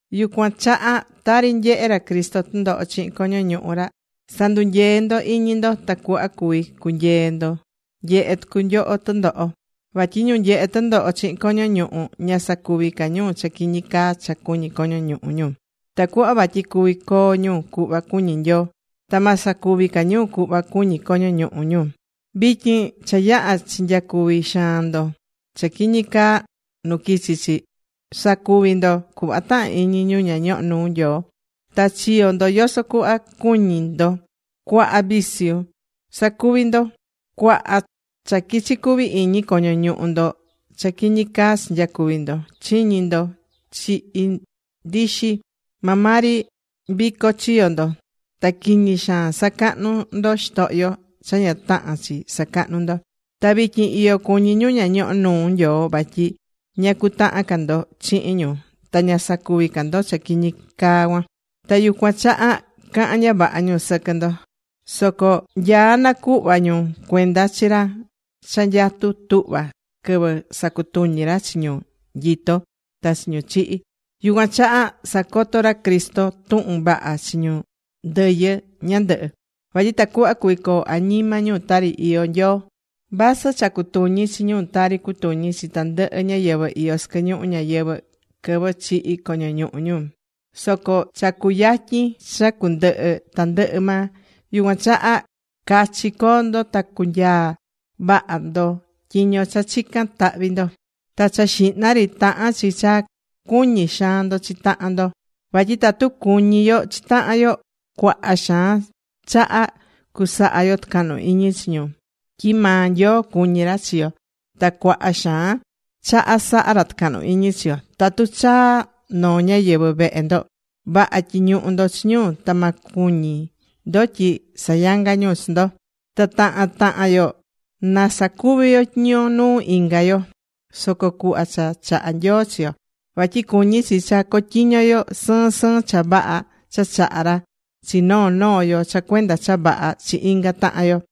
Yucuan chaha tari nyehe̱ ra Cristo tɨndoho chihin coño ñuhu ra, sa̱ndunyee ndo iñi ndo tacuhva cuví cunyee ndo nyehé tucu nyoho tɨndoho. Vatyi ñu nyehé tɨndoho chihin coño ñuhu, ña sacuví ca ñu cha quiñi caa cha cuñí coño ñuhu ñu. Tacuhva vatyi cuvi coo ñu cuhva cuñí Nyoo. Ta ma sacuvi ca ñu cuhva cuñí coño ñuhu ñu. Vityin cha yaha chinyacuvi̱ xaan ndo cha quiñi caa nu quichi chi. Sacuvi̱ ndo cuhva tahán iñi ñu ña ñohó nuu Nyoo. Ta chiyo̱ ndo yoso cuhva cuñi̱ ndo, cuaha viciu sacuvi̱ ndo, cuaha cha quichi cuvi iñi coño ñuhu ndo cha quiñi caa chinyacuvi̱ ndo. Chiñi̱ ndo chihin ndixi. Maa maa ri vico chiyo̱ ndo. Ta quiñi xaan sacahnu̱ ndo xitohyo cha ña tahán chi sacahnú ndo. Ta vityin iyo cuñí ñu ña ñohó nuu Nyoo vatyi ña cutahán ca ndo chihin ñu ta ña sacuví ca ndo cha quiñi caa cuan. Ta yucuan chaha cahán ña vaha ñu sɨquɨ ndo. Soco nyaá nacuhva ñu cuenda chi ra cha nyatú tuhva quɨvɨ sacutuñi ra chi ñu nyitó ta chi ñu chihi̱. Yucuan chaha sacoto̱ ra Cristo tuhun vaha chi ñu ndɨyɨ ñandɨhɨ. Vatyi tacuhva cuvi coo añima ñu tari iyó Nyoo, vasɨ cha cutuñi̱ chi ñu tari cutuñí chi tandɨhɨ ñáyɨvɨ iyó sɨquɨ ñuhu ñayɨvɨ̱ quɨvɨ chihí coño ñuhu ñu. Soco cha cuyatyin cha cundɨhɨ tandɨhɨ maa. Yucuan chaha cachi co̱o ndo ta cunyaa vaha ndo tyiño cha chicán tahvi ndo. Ta cha xihna ri tahán chi cha cuñi xaan ndo chi tahan ndo. Vatyi tatu cuñí yo chi tahan yo, cuaha xaan chaha cusaha yo tɨcahnu iñi chi ñu, tyi maa Nyoo cuñí ra chi yo ta cuaha xaan chaha sahá ra tɨcahnu iñi chi yo. Tatu chaá noo ñáyɨvɨ vehe ndo, vaha tyi̱ñuhu ndo chi ñu ta ma cuñi ndo tyi sayangá ñu chi ndo. Ta tahan tahan yo na sacuvi yo tyiño nuu inga yo, yoso cuhva cha chahá Nyoo chi yo. Vatyi cuñí chi cha cotyiño yo sɨɨn sɨɨn cha vaha cha chahá ra chi noo noo yo cha cuenda cha vaha chi inga tahan yo.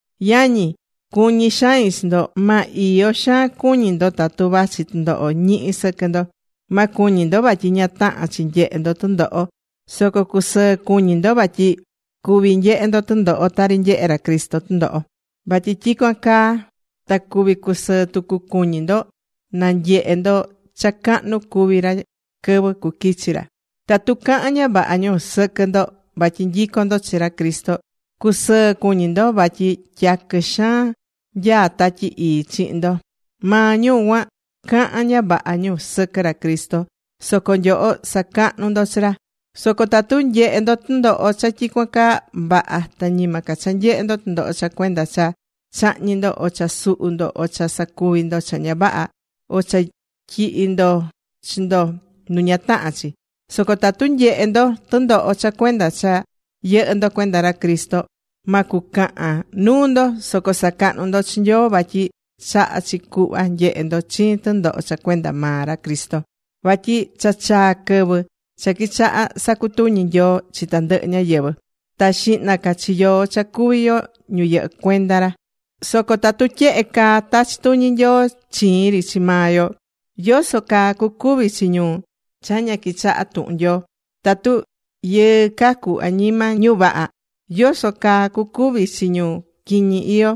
Yañi, cuñí xain chi ndo. Ma iyo xaan cuñi ndo tatu vachi tɨndoho ñihi sɨquɨ ndo. Ma cuñi ndo vatyi ña tahán chi nyehe ndo tɨndoho. Soco cusɨɨ cuñi ndo vatyi cuví nyehe ndo tɨndoho tari nyehe̱ ra Cristo tɨndoho. Vatyi tyicuan caa ta cuvi cusɨɨ tucu cuñi ndo na nyehe ndo cha cahnu cuví ra quɨvɨ cuquichi ra. Tatu cahán ña vaha ñu sɨquɨ ndo vatyi nyicón ndo chi ra Cristo, cu̱sɨɨ cuñi ndo, vatyi tyaquɨ xaan nyaá Tatyi Ii chihin ndo. Maa ñu cuan cahán ña vaha ñu sɨquɨ ra Cristo, soco nyoho sacahnú ndo chi ra. Soco tatu nyehé ndo tɨndoho cha tyicuan caa, vaha, ta ñima ca cha nyehé ndo tɨndoho cha cuenda cha chahñi̱ ndo, o cha suhu̱ ndo, o cha sacuvi̱ ndo cha ña vaha, o cha tyihi̱ ndo chi ndo nu ña tahán chi. Soco tatu nyehé ndo tɨndoho cha cuenda cha yɨhɨ́ ndo cuenda ra Cristo, ma cucahan nuu ndo. Soco sa̱cahnu ndo chi Nyoo, vatyi chahá chi cuhva nyehe ndo chiin tɨndoho cha cuenda maa ra Cristo. Vatyi cha chaa̱ quɨvɨ cha quichaha̱ sacutuñi Nyoo chi tandɨhɨ ñáyɨvɨ. Ta xihna ca chi yoó cha cuví yo ñu yɨhɨ́ cuenda ra. Soco tatu tyehe caa tachí tuñi Nyoo chiin ri chi maa yo, ¿yoso caa cucuvi chi ñu cha ña quichahá tuhun Nyoo? Tatu yɨɨ cacú añima ñu vaha, ¿yoso caa cucuvi chi ñu quiñi iyó,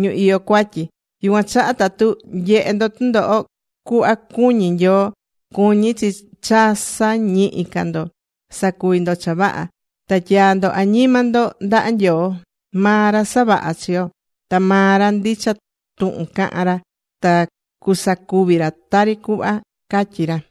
ñu iyó cuatyi? Yucuan chaha tatu nyehé ndo tɨndoho cuhva cuñí Nyoo, cuñí chi cha sa̱ñihi ca ndo sacuvi ndo cha vaha. Ta tya̱a ndo añima ndo ndaha Nyoo. Maa ra savaha̱ chi yo, ta maa ra ndicha tuhun cahán ra ta cusacuví ra tari cuhva catyí ra.